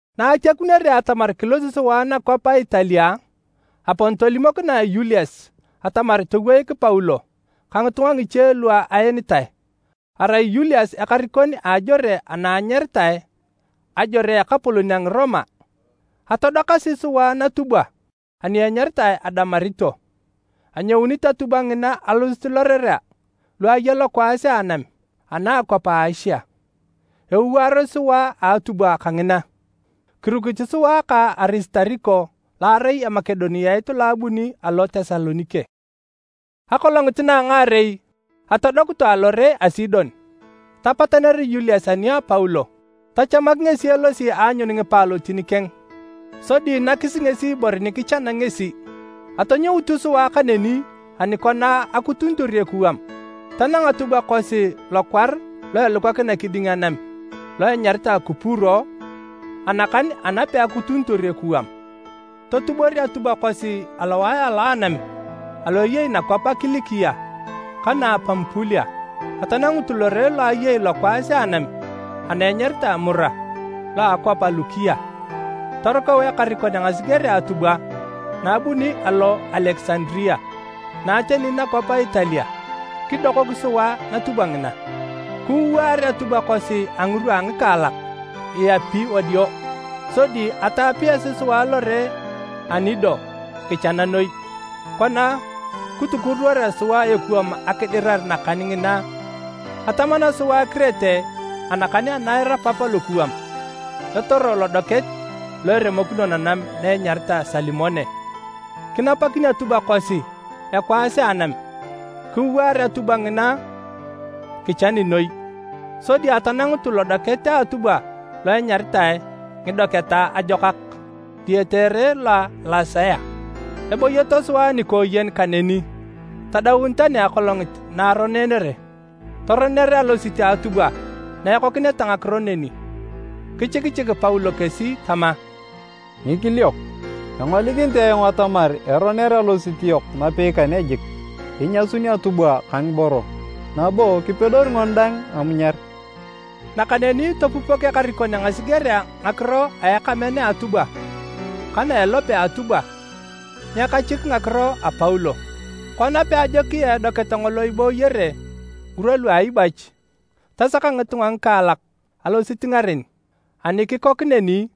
Na atiakunere atamar kilosi sua nakwap a Italia, apon tolimokinae Yulius atamar toweik Paulo ka ngitunga ngiche lu aenitae. Arai Yulius ekarikon a ajore ana enyaritae, “Ajore a ekapolon a Ngiroma.” Atodokasi sua natubwa ani enyaritae Adaramito. Anyounit atubwa ngina alosit lorerea lu aya lokwaas a anam ana a akwap a Asia, ewaaros sua a atubwa kangina. Kirukit sua ka Arisitariko lo arai Emakedoniat lo abuni alo Tesalonike. Akolongit na a ngaarei, atodokutu alore a Sidon. Tapataner Yulius ani a Paulo, tachamak ngesi elosi aanyun ngipaalotin keng sodi nakis ngesi ibore ni kichana ngesi. Atonyoutu sua kaneni ani kona akutunitor ekuwam, tanang atubwa kosi lokwar lo elukakina kiding anam lo enyaritae Kupuro anakan ana peakutunitor ekuwam. Totubor atubwa kosi alowae a anam alo ayei nakwapea a Kilikia ka na a Pamupulia atanangutu lore lo ayei lokwaas a anam ana enyaritae Mura, lo a akwap a Lukia. Torukau ekarikon a ngasigerea atubwa na abuni alo Alekisandaria na ateni nakwap a Italia, kidokok sua natubwa ngina. Kiwaar atubwa kosi a ngirwa a ngikaalak, iyapi wadio. Sodi ataapiasi sua lore a Nido kichana noi. Kona kitukuruworea sua ekuwam akidirar nakan ngina, atamana sua Kirete anakan ana erapap alokuwam, etoro lodoket lo eremokino nanam na enyaritae Salimone. Kinapakin atubwa kosi ekwaas a anam. Kiwaar atubwa ngina kichani noi sodi atanangutu lodoket a atubwa lo enyaritae “Ngidoketa Ajokak”, diyete ere lo a Lasea. Ebooyoto sua nikooyen kaneni tadaun tani Akolongit na Aronere. Toroner alosit a atubwa na ekokineta ngakiro neni. Kichikichik Paulo kesi tama, “Ngikiliok, engolikinit ayong atamar eroner alosit yok napei kane jik. Inyasun atubwa ka ngiboro, nabo kipedori ngoni dang amunyar.” Nakaneni topupok ekarikon a ngasigerea ngakiro a ekamean a atubwa ka na a elope a atubwa nyekachik ngakiro a Paulo. Kona peajokia edoket ngolo ibooyere ngirwa lua aibach, tasaka ngitunga ngikaalak alosit ngaren, ani kikok neni,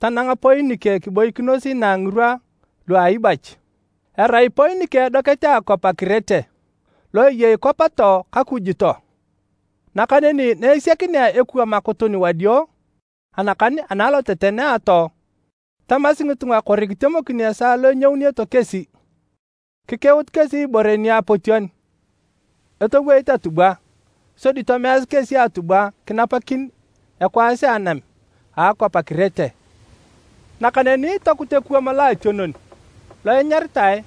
tananga Poinike kiboikinos inaa ngirwa lu aibach. Erai Poinike edoket a akwap a Kirete, lo eyei kwap too ka kuju too. Nakaneni na esiakinea ekuwam akutun wadio anakan ana aloteten a atoo, tamasi ngitunga kori kitemokin esaa lo enyouneto kesi. Kikeut kesi ibore niapotion etoweit atubwa sodi tomeasi kesi atubwa kinapakin ekwaas a anam a akwap a Kirete. Nakaneni tokut ekuwam loationon, lo enyaritae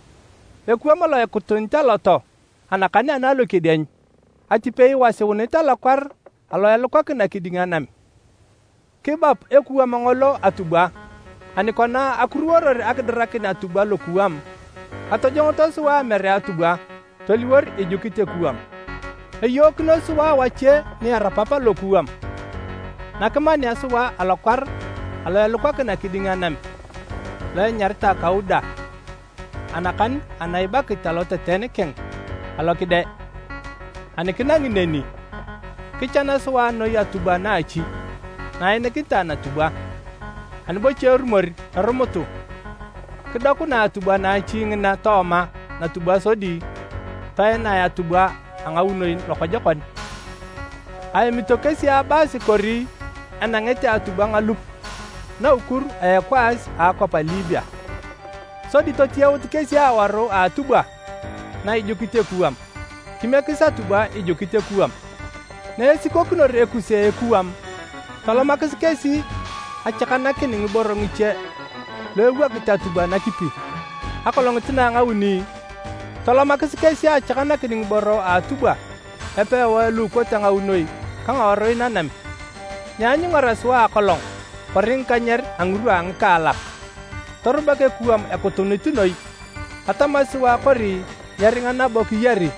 “Ekuwam lo ekutunit alo too anakan ana Lokedieny” atipei iwasiunit alokwar alo elukakina kiding anam. Kibap ekuwam ngolo atubwa, ani kona akuruworor akidirakin atubwa lokuwam, atojongoto sua amere atubwa toliwor ijukit ekuwam. Eyookinos sua wache ni erapap alokuwam na kimanea sua alokwar alo elukakina kiding anam lo enyaritae Kauda anakan ana ibakit aloteten keng, alo kide. Ani kinangi neni, kichan sua noi atubwa naachi na ainikinitae natubwa, ani bocha erumor, erumutu. Kidokunae atubwa naachi ngina tooma natubwa sodi toenae atubwa a ngaunoi lokojokon. Aemito kesi abaasi kori enangete atubwa ngalup naukur a ekwaas a akwap a Libia. Sodi totiyaut kesi awaru a atubwa na ijukit ekuwam, kimiekis atubwa ijukit ekuwam. Na esikokinor ekuse a ekuwam, tolomakis kesi achakanakin ngiboro ngiche lu ewokit atubwa nakipi, akolongit na a ngauni, tolomakis kesi achakanakin ngiboro a atubwa epewae lu ikote ngaunoi ka ngawarui nanam. Nyeanyungara sua akolong kori ngikanyer a ngirwa a ngikaalak. Torubak ekuwam ekutunit noi. Atamasi sua kori nyeringa nabo kiyari.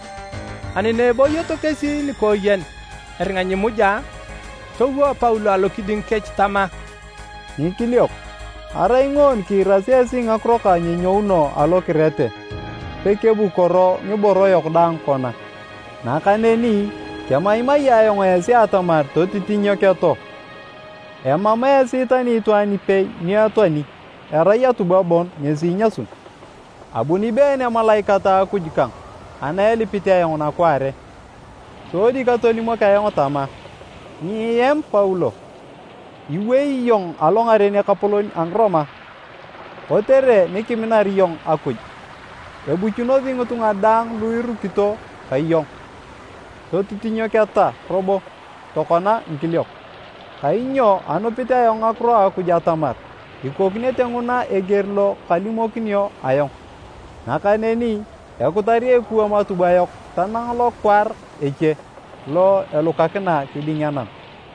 Ani na ebooyoto kesi nikooyen eringa nyimuja, towo Paulo alokiding kech tama, “Ngikiliok, arai ngoon kiirasi esi ngakiro kang nyenyouno alo Kirete, pekebukoro ngiboro yok daang kona. Nakaneni kemaimai ayong esi atamar totitinyoketo! Emam esi tani itwaan ipei ni etoani, erai atubwa bon ngesi inyasun. Abuni been emalaikat a Akuj kang ana elipit ayong nakwaare, sodi katolimok ayong tama, ‘Nyiem Paulo! Iwei iyong alongaren ekapolon a Ngiroma. Kotere ni kiminar iyong Akuj, ebuchunosi ngitunga daang lu irukito ka iyong!’ Totitinyoketa robo tokona ngikiliok, kainyo anupit ayong ngakiro a Akuj atamar ikokinete nguna eger lo kalimokinio ayong. Nakaneni ekutari ekuwam atubwa yok tanang lokwar eche lo elukakina kiding anam.”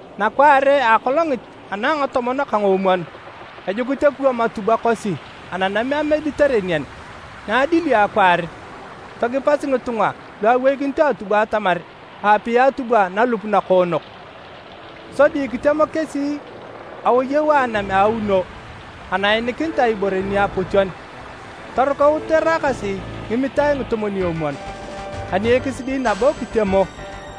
Nakwaare a akolongit ana a ngatomon ka ngoomwon, ejukit ekuwam atubwa kosi ananam a Mediterenian. Na adilio akwaar, togipasi ngitunga lu aweikinito atubwa atamar aapia atubwa nalup nakoonok. Sodi kitemo kesi aoyau a anam a auno ana ainikinitae ibore niapotion. Torukaut eraakasi ngimitae ngitomwon-omwon. Ani ekisidi nabo kitemo,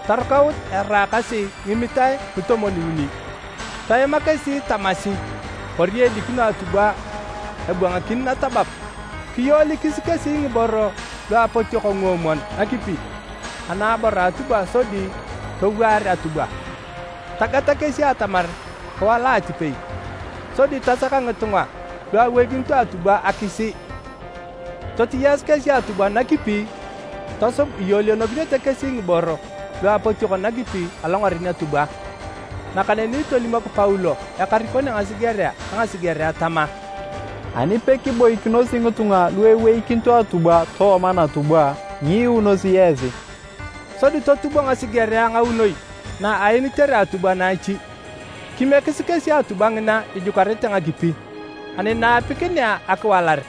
torukaut eraakasi ngimitae ngitomwon-uni. Toema kesi tamasi kori edikino atubwa ebwangakin natabab. Kiyoolikis kesi ngiboro lu apotiok nguomwon nakipi anaabor a atubwa sodi towaar atubwa. Tagata kesi atamar kiwala atipei. Sodi tasaka ngitunga lu aweikinito atubwa akisii. Totiyaasi kesi atubwa nakipi tosub iyoolionokinete kesi ngiborei lu apotiok nakipi alongaren atubwa. Nakaneni tolimok Paulo ekarikon a ngasigerea ka ngasigerea tama, “Ani pekiboikinosi ngitunga lu eweikinito atubwa tooma natubwa, nyiiunosi esi.” Sodi totubo ngasigerea ngaunoi na aenitere atubwa naachi, kimiekis kesi atubwa ngina ijukarete ngakipi. Ani na apikinea akiwalar,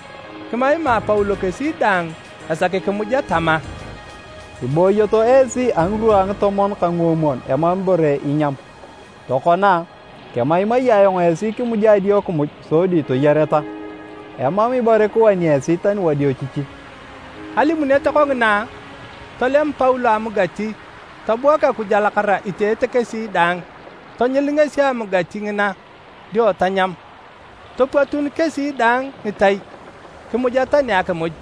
kimaima Paulo kesi daang esaki kimuja tama, “Ibooyoto esi a ngirwa a ngitomon ka nguomwon emam ibore inyam. Tokona, kemaimai ayong esi kimuja adio kimuj sodi toyareta. Emam ibore kiwani esi tani wadiochichi.” Alimunet kongina, tolem Paulo amugati tobuak Akuj alakara iteete kesi daang. Tonyil ngesi amugati ngina dio tanyam. Topwatun kesi daang ngitai kimuja tani akimuj.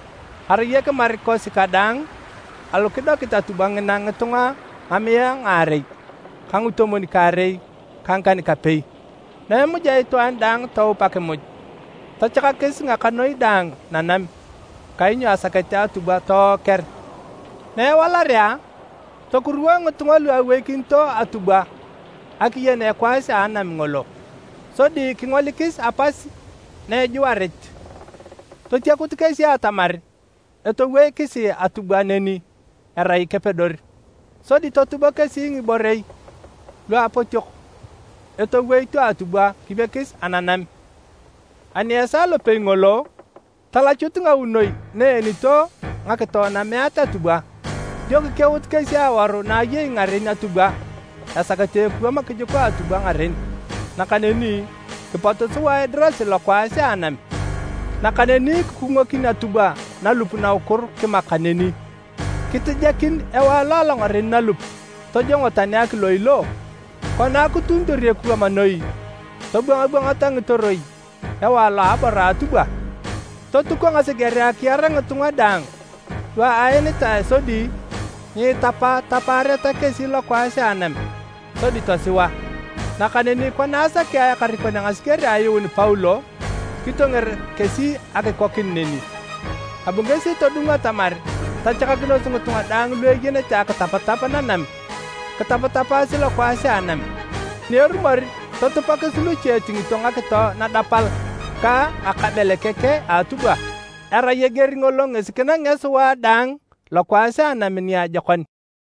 Arai ekimar kosi kadaang alu kidokit atubwa ngina ngitunga ngamiae ngaarei ka ngitomwon-kaarei ka ngikan-kapei. Na emuja itwaan daang toup akimuj, tachakakis ngakanoi daang nanam kainyo asakete atubwa tooker. Na ewalarea, tokuruwo ngitunga lu aweikinito atubwa akiyen ekwaas a anam ngolo. Sodi kingolikis apas na ejuarit. Totiakut kesi atamar etoweikisi atubwa neni erai kepedor. Sodi totubo kesi ngiborei lu apotiok etoweito atubwa kimiekis ananam. Ani esaa lopei ngolo, talachut ngaunoi na eenito ngakito nameet atubwa. Dio kikeut kesi awaru na ayei ngaren atubwa esakete ekuwam kijuka atubwa ngaren. Nakaneni, kipotu sua edirasi lokwaas a anam. Nakaneni kikungokin atubwa nalup naukur kimak kaneni. Kitijakin ewae lo alongaren nalup tojongo tani akiloiloo. Kona akutunitor ekuwam noi, tobwangabwangata ngitoroi ewae lo aabor a atubwa. Totuko ngasigerea akiar ngitunga daang lu aenitae sodi nyiitapatapaareta kesi lokwaas a anam sodi tosiwa. Nakaneni kona asakea ekarikon a ngasigerea ayuun Paulo, kitonger kesi akikokin neni. Abu ngesi todung atamar tachakakinos ngitunga daang lu eyenete akitapatap nanam kitapatapaasi lokwaas a anam. Ani erumor, totupakis luche etingito ngakito nadapal ka ngakabelekeke a atubwa. Erai eger ngolo ngesi kinangea sua daang lokwaas a anam niajokon.